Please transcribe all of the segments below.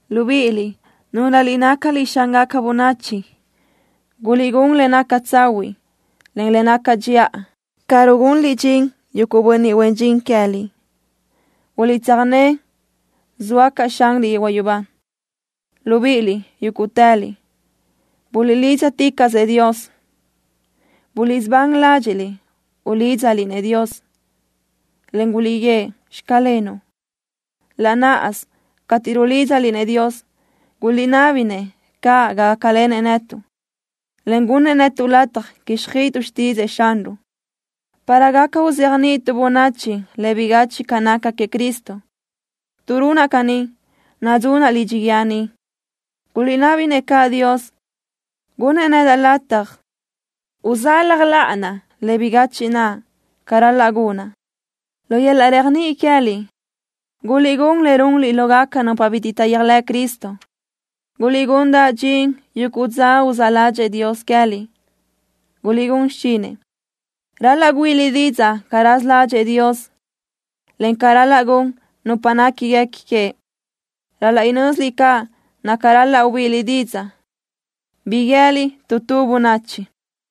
Libíʼiliʼ, núlöliʼ nácaliʼ xángaca bönachi, guliʼgún le naca tsahuiʼ, en le naca dxiʼa ca rugunliʼ dxin yuguʼ bönniʼ huen dxin queë́liʼ. Guliʼtsöjné zoa caʼ Xanliʼ yehuaʼ yubá. Libíʼiliʼ, yúguʼtëliʼ, buliʼlídzaticaʼsëʼ Dios. Buliʼsubán ládxiʼliʼ ulídzaliʼ-nëʼ Dios, en guliʼguíëʼ: “Xclenuʼ.” Laʼ náʼasö cateʼ rulídzaliʼ-nëʼ Dios, guliʼnabi-nëʼ caʼ gácalenëʼ netuʼ, en gunnëʼ netuʼ lataj quíxjöʼötuʼ xtídzëʼë Xanruʼ, para gaca uzéajniʼituʼ bönachi le bigachiʼ ca naca queëʼ Cristo. Tuʼ runaʼ caní nadzunaʼ lidxi guíë ni. Guliʼnabi-nëʼ caʼ Dios, gunnëʼ nedaʼ lataj usalaj láʼanaʼ le bigachiʼ naʼ ca ral-laʼ gunaʼ. Lu yöl-laʼ réajniʼi queë́liʼ, guliʼgún le runliʼ lógaca nupa bitiʼ taʼyéajlëʼ Cristo. Guliʼgundaʼ dxin yuguʼ dza uzáʼ ládxëʼë Dios queë́liʼ, gunliʼ xichinëʼ. Ral-laʼ güíʼiliʼ didzaʼ ca raza ládxëʼë Dios, en ca ral-laʼ gun nupa néquiguequi queëʼ. Ral-laʼ inö́ziliʼ caʼ naca ral-laʼ ubíʼiliʼ didzaʼ, bi guië́liʼ tu tu bönachi.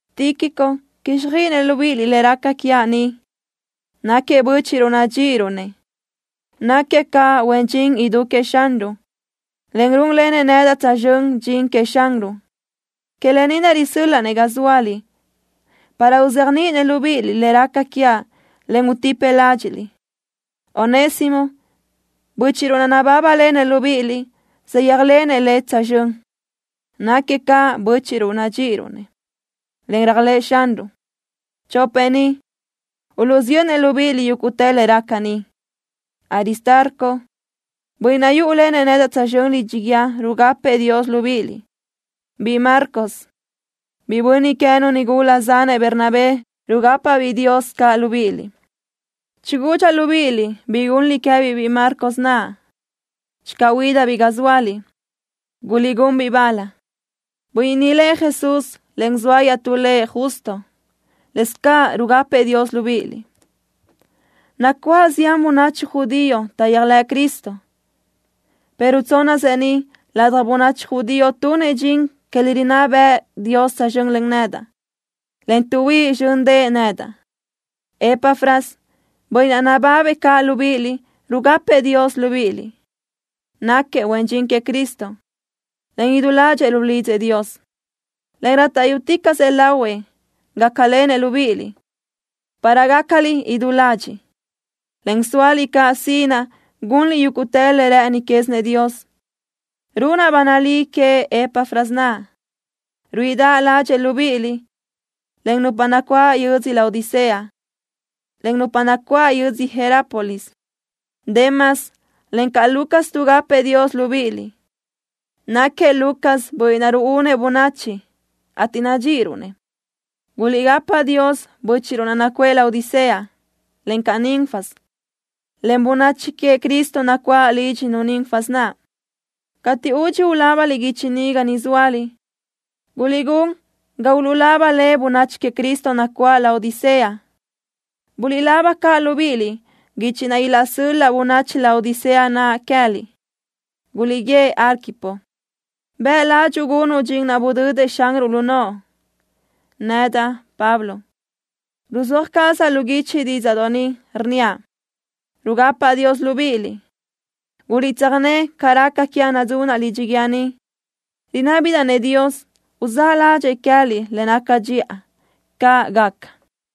Tíquico quíxjöiʼinëʼ libíʼiliʼ le raca quiaʼ ni. Náquiëʼ bö́chiʼruʼ nadxíʼiruʼ-nëʼ. Náquiëʼ caʼ huen dxin idú queëʼ Xanruʼ, en rúnlenëʼ nedaʼ tsözxö́n dxin queëʼ Xanruʼ. Que lë ni naʼ risö́l-laʼa-nëʼ ga zóaliʼ, para uzéajniʼinëʼ libíʼiliʼ le raca quiaʼ, en utipëʼ ládxiʼliʼ. Onésimo, bö́chiʼruʼ naʼ nabábalenëʼ libíʼiliʼ saʼyéajlenëʼ lëʼ tsözxö́n. Náquiëʼ caʼ bö́chiʼruʼ nadxíʼiruʼ-nëʼ, en réajlëʼë Xanruʼ. Chopëʼ ni uluʼsiyönnëʼ libíʼiliʼ yúguʼtë le raca ni. Aristarco, bönniʼ naʼ yúʼulenëʼ nedaʼ tsözxö́n lidxi guíë rugapëʼ Dios libíʼiliʼ. Biʼi Marcos, biʼi bönniʼ queë́nu nigula zanëʼ Bernabé rugápabiʼ Dios caʼ libíʼiliʼ. Chigudxaʼ libíʼiliʼ bi gunliʼ queë́biʼ biʼi Marcos naʼ. Channö huídabiʼ ga zóaliʼ, guliʼgún-biʼ bal. Bönniʼ ni lëʼ Jesús, en zoa iaʼtú lëʼ Justo lëscaʼ rugapëʼ Dios libíʼiliʼ. Nacuáʼ zián bönachi judío taʼyéajlëʼ Cristo, pero tsónnasëʼ ni ladaj bönachi judío tunëʼ dxin que le rinná bëʼë Dios tsözxö́n len nedaʼ, en tuʼhuíʼ zxö́ndëʼë nedaʼ. Epafras, bönniʼ ni nababëʼ caʼ libíʼiliʼ rugapëʼ Dios libíʼiliʼ. Náquiëʼ huen dxin queëʼ Cristo, en idú ládxëʼë rulidzëʼ Dios, en rátaʼyuticaʼsëʼ lahuëʼ gácalenëʼ libíʼiliʼ para gácaliʼ idú ladxiʼ, en sóaliʼ caʼ sinaʼ gunliʼ yúguʼtë le rë́ʼëni quézinëʼ Dios. Runaʼ ba nalí queëʼ Epafras naʼ, ruíʼidaʼ ládxëʼë libíʼiliʼ encaʼ nupa nacuáʼ yödzö Laodicea, en nupa nacuáʼ yödzö Hierápolis. Demas, encaʼ Lucas tuʼgapëʼ Dios libíʼiliʼ. Náquiëʼ Lucas bönniʼ naʼ ruúnëʼ bönachi, ateʼ nadxíʼiruʼ-nëʼ. Guliʼgapa Dios bö́chiʼruʼ nacuʼë Laodicea, encaʼ Ninfas, en bönachi queëʼ Cristo nacuáʼ lídxinu Ninfas naʼ. Cateʼ údxi ulábaliʼ guichi ni ga niʼ zóaliʼ, guliʼgún ga uluʼlaba le bönachi queëʼ Cristo nacuáʼ Laodicea. Buliʼlaba caʼ libíʼiliʼ guichi naʼ ilaʼsöl-laʼ bönachi Laodicea naʼ queë́liʼ. Guliʼguíëʼ Arquipo: “Bëʼ ládxuʼu gunuʼ dxin naʼ budödëʼ Xanruʼ lu noʼo.” Nedaʼ, Pablo, ruzúaj cazaʼ lu guichi dídzaʼdoʼ ni, rnníaʼ: Rugapaʼ Dios libíʼiliʼ. Guliʼtsöjné ca raca quiaʼ nadzunaʼ lidxi guíë ni. Rinábidaʼ-nëʼ Dios uzáʼ ládxëʼë queë́liʼ le naca dxiʼa. ¡Caʼ gaca!